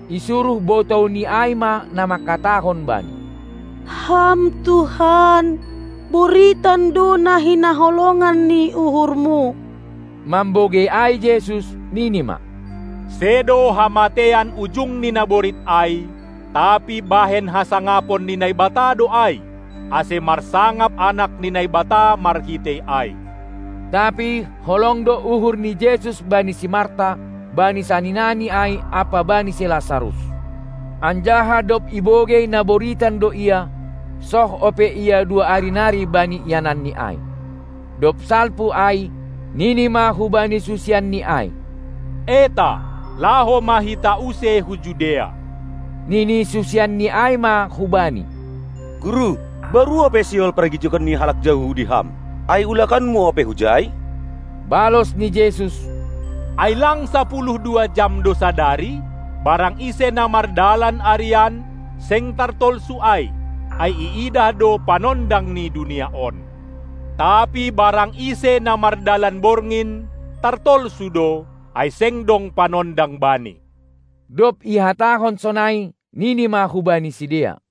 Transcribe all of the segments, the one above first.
Isuruh botouni ai ma na mangkatahon Bani: Ham Tuhan, boritan do na hinaholongan ni uhurmu! Mambogei ai Jesus, nini ma: Sedo hamateian ujung ni naborit ai, tapi bahen hasangapon ni Naibata do ai, ase marsangap Anak ni Naibata marhitei ai. Tapi holong do uhur ni Jesus bani si Marta, bani saninani ai ampa bani si Lasarus. Anjaha dob ibogei na boritan do ia, soh ope Ia dua ari nari bani iananni ai. Dob salpu ai, nini ma hubani susianNi ai: Eta, laho ma hita use hu Judea! Nini susianni ai ma hu Bani: Guru baru ope sihol pargijigon ni halak Jahudi Ham, ai ulakanMu ope hujai? Balos ni Jesus: Ai lang sapuluh dua jam do sadari? Barang ise na mardalan arian, seng tartolsu ai, ai iidah do panondang ni dunia on. Tapi barang ise na mardalan borngin, tartolsu do, ai seng dong panondang bani. Dob ihatahon sonai, nini ma hubani sidea: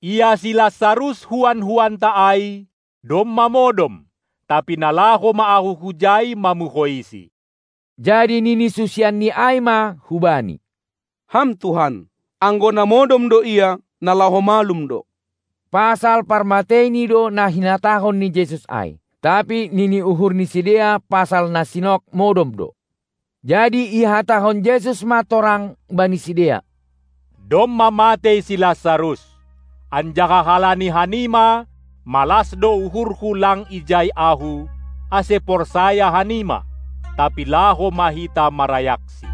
Ia si Lasarus, huan-huanta ai, domma modom; tapi na laho ma Ahu hujai mamuhoisi. Jadi nini susianNi ai ma hu-Bani: Ham Tuhan, anggo na modom do ia, na laho malum do. Pasal parmateini do na hinatahon ni Jesus ai; tapi nini uhur ni sidea pasal na sinok modom do. Jadi ihatahon Jesus ma torang bani sidea: Domma matei si Lasarus, anjaha halani hanima malas do uhurHu lang ijai ahu, ase porsaya hanima; tapi laho ma hita marayaksi.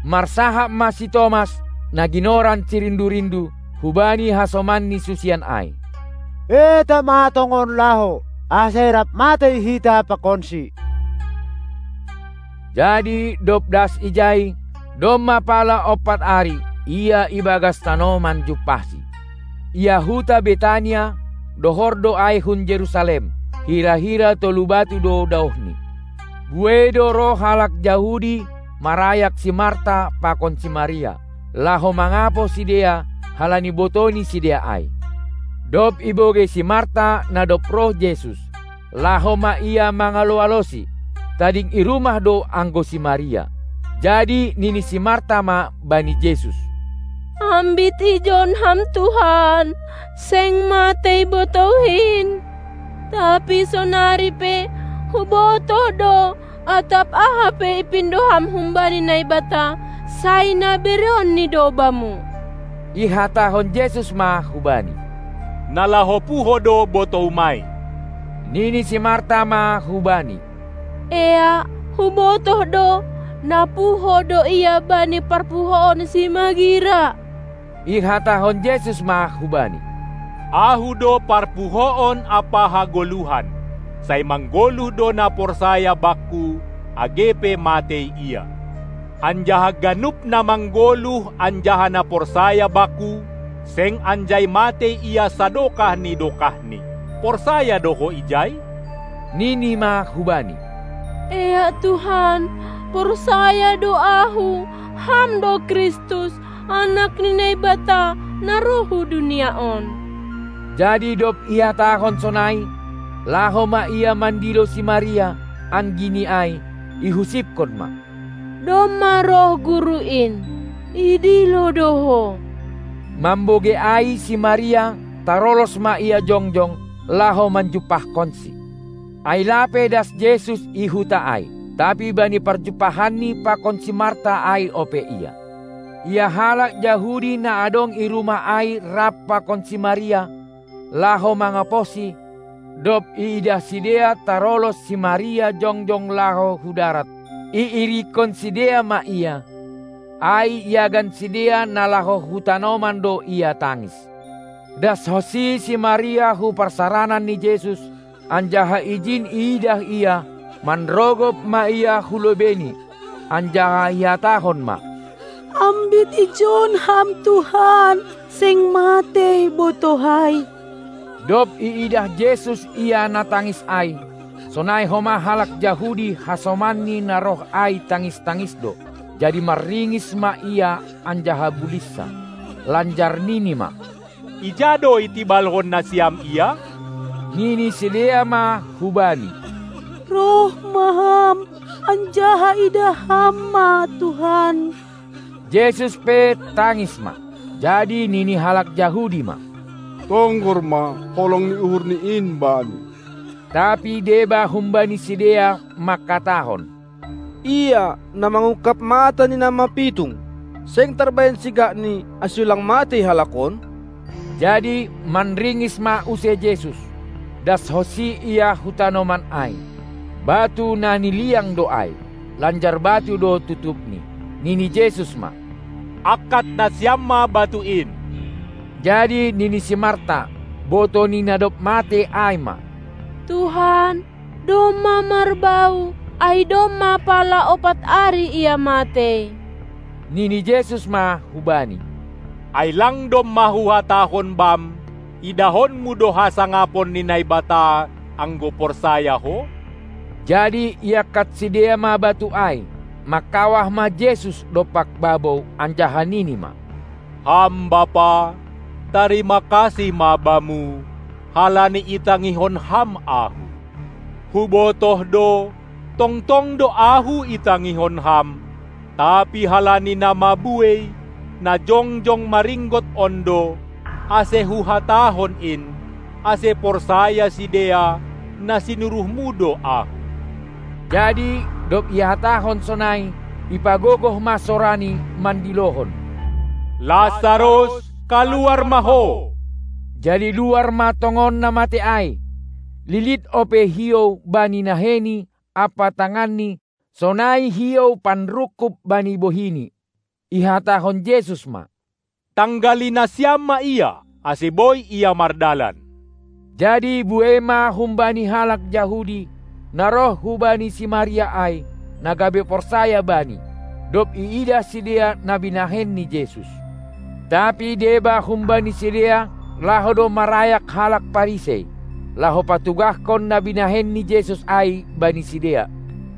Marsahap ma si Tomas, na ginoran si Rindu-rindu, hubani hasomanni susian ai: Eta ma tongon laho, ase rap matei hita pakonsi! Jadi dob das ijai, domma pala ompat ari ia ibagas tanoman jumpahaSi. Ia huta Betania, dohor do ai hun Jerusalem, hira-hira tolu batu do daohni. Buei do roh halak Jahudi marayak si Marta pakon si Maria, laho mangapoh sidea halani botou ni sidea ai. Dob ibogei si Marta na dob roh Jesus, laho ma ia mangalo-aloSi; tading i rumah do anggo si Maria. Jadi nini si Marta ma bani Jesus: Ambit ijon Ham Tuhan, seng matei botouhin! Tapi sonari pe, hubotoh do, atap aha pe ipindo Ham humbani Naibata, sai na bereonNi do Bamu. Ihatahon Jesus ma hubani: Na laho puho do botoumai! Nini si Marta ma hu-Bani: Eak, hubotoh do, na puho do ia bani parpuhoon simagira. Ihatahon Jesus ma hubani: Ahu do parpuhoon ampa hagoluhan. Sai manggoluh do na porsaya Bakku, age pe matei ia. Anjaha ganup na manggoluh anjaha na porsaya Bakku, seng anjai matei ia sadokah ni dokahni! Porsaya do ho ijai? Nini ma hu-Bani: Eak Tuhan, porsaya do ahu, Ham do Kristus, Anak ni Naibata, na roh hu dunia on. Jadi dob ihatahon sonai, laho ma ia mandilo si Maria, anggini ai, ihusipkon ma: Domma roh Guru in, idilo do ho! Mambogei ai si Maria tarolos ma ia jongjong, laho manjumpahkonSi, ai lape das Jesus i huta ai, tapi bani parjumpahanni pakon si Marta ai ope Ia. Ia halak Jahudi na adong i rumah ai rap pakon si Maria, laho mangapohsi, dob iidah sidea tarolos si Maria jongjong laho hu darat, iirikkon sidea ma ia, ai iagan sidea na laho hu tanoman do ia tangis. Dashonsi si Maria hu parsaranan ni Jesus, anjaha ijin iidah Ia, manrogop ma ia hu lobeiNi, anjaha ihatahon ma: Ambit ijon Ham Tuhan, seng matei botouhai! Dob iidah Jesus ia na tangis ai, sonai homa halak Jahudi hasomanni na roh ai tangis-tangis do, jadi manringis ma Ia anjaha bulinsah, lanjar nini ma: Ija do itibalhon nasiam ia? Nini sidea ma hu-Bani: Roh ma Ham, anjaha idah Ham ma, Tuhan! Jesus pe tangis ma. Jadi nini halak Jahudi ma: Tonggor ma, holong ni uhurNi in bani! Tapi deba humbani sidea mangkatahon: Ia, na mangungkab mata ni na mapitung, seng tarbahenSi gakni, ase ulang matei halak on? Jadi manringis ma use Jesus, dashonsi Ia hu tanoman ai. Batu na niliang do ai, lanjar batu do tutupni. Nini Jesus ma: Angkat nasiam ma batu in! Jadi nini si Marta, botou ni na dob matei ai ma: Tuhan, domma marbau, ai domma pala ompat ari ia matei. Nini Jesus ma hubani: Ai lang domma Huhatahon bam, idahonmu do hasangapon ni Naibata, anggo porsaya ho? Jadi iangkat sidea ma batu ai. Mangkawah ma Jesus dompak babou anjaha nini ma: Ham Bapa, tarima kasih ma Bamu, halani itangihon Ham Ahu! Hubotoh do, tongtong do Ahu itangihon Ham, tapi halani na mabuei, na jongjong maringgot on do, ase Huhatahon in, ase porsaya sidea, na sinuruhmu do Ahu. Jadi dob ihatahon sonai, ipagogoh ma soraNi mandilohon: Lasarus, kaluar ma ho! Jadi luar ma tongon na matei ai; lilit ope hiou bani naheini ampa tanganni sonai hiou panrungkub bani bohini. Ihatahon Jesus ma: Tanggali nasiam ma ia, ase boi ia mardalan. Jadi buei ma humbani halak Jahudi, na roh hubani si Maria ai, na gabe porsaya Bani, dob iidah sidea na binahen ni Jesus. Tapi deba humbani sidea laho do marayak halak Parisei, laho patugahkon na binahen ni Jesus ai bani sidea.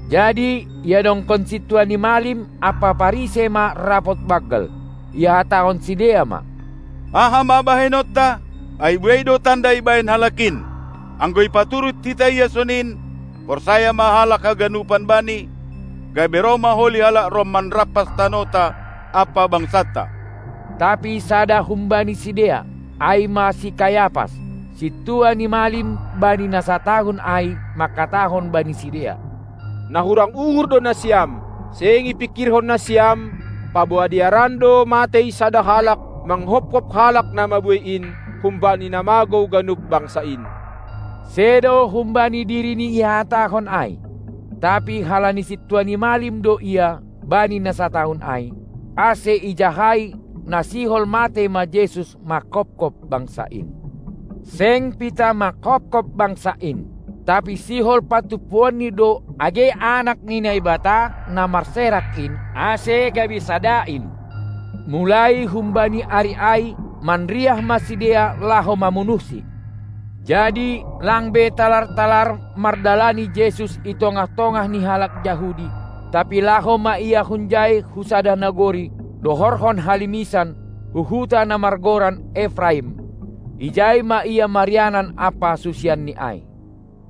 Jadi iadongkon sintua ni malim ampa Parisei ma rapot banggal, ihatahon sidea ma: Aha ma bahenonta? ai buei do tanda ibahen Halak in! Anggo ipaturut hita Ia sonin, porsaya ma halak haganupan Bani, gabe roh ma holi halak Rom manrampas tanohta ampa bangsanta. Tapi sada humbani sidea, ai ma si Kayapas, sintua ni malim bani na satahun ai mangkatahon bani sidea: Na hurang uhur do nasiam! Seng ipingkirhon nasiam, paboa dearan do matei sada halak manghophop halak na mabuei in, humbani na magou ganup bangsa in. Sedo humbani dirini ihatahon ai; tapi halani sintua ni malim do ia bani na satahun ai, ase ijahai, na sihol matei ma Jesus mangkopkop bangsa in. Seng pitah mangkopkop bangsa in, tapi sihol patumpuonni do age anak ni Naibata na marserak in ase gabe sada in. Mulai humbani ari ai manriah ma sidea laho mamunuhsi. Jadi lang be talar-talar mardalani Jesus i tongah-tongah ni halak Jahudi, tapi laho ma Ia hunjai hu sada nagori, dohorhon halimisan, hu huta na margoran Efraim; ijai ma Ia marianan ampa susianNi ai.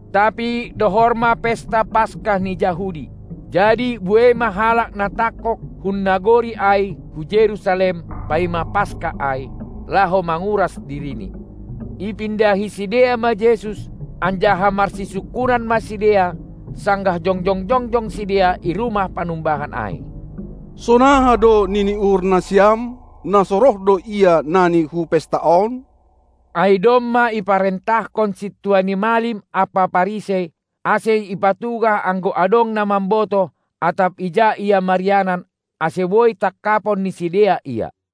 Tapi dohor ma Pesta Paska ni Jahudi, jadi buei ma halak na tangkog hun nagori ai hu Jerusalem, paima Paska ai, laho manguras dirini. Ipindahi sidea ma Jesus, anjaha marsisungkunan ma sidea, sanggah jongjong-jongjong sidea i rumah panumbahan ai. Sonaha do nini uhur nasiam? Na so roh do Ia nani hu pesta on? Ai domma iparentahkon sintua ni malim ampa Parisei, ase ipatugah anggo adong na mambotoh, atap ija Ia marianan, ase boi tangkapon ni sidea Ia.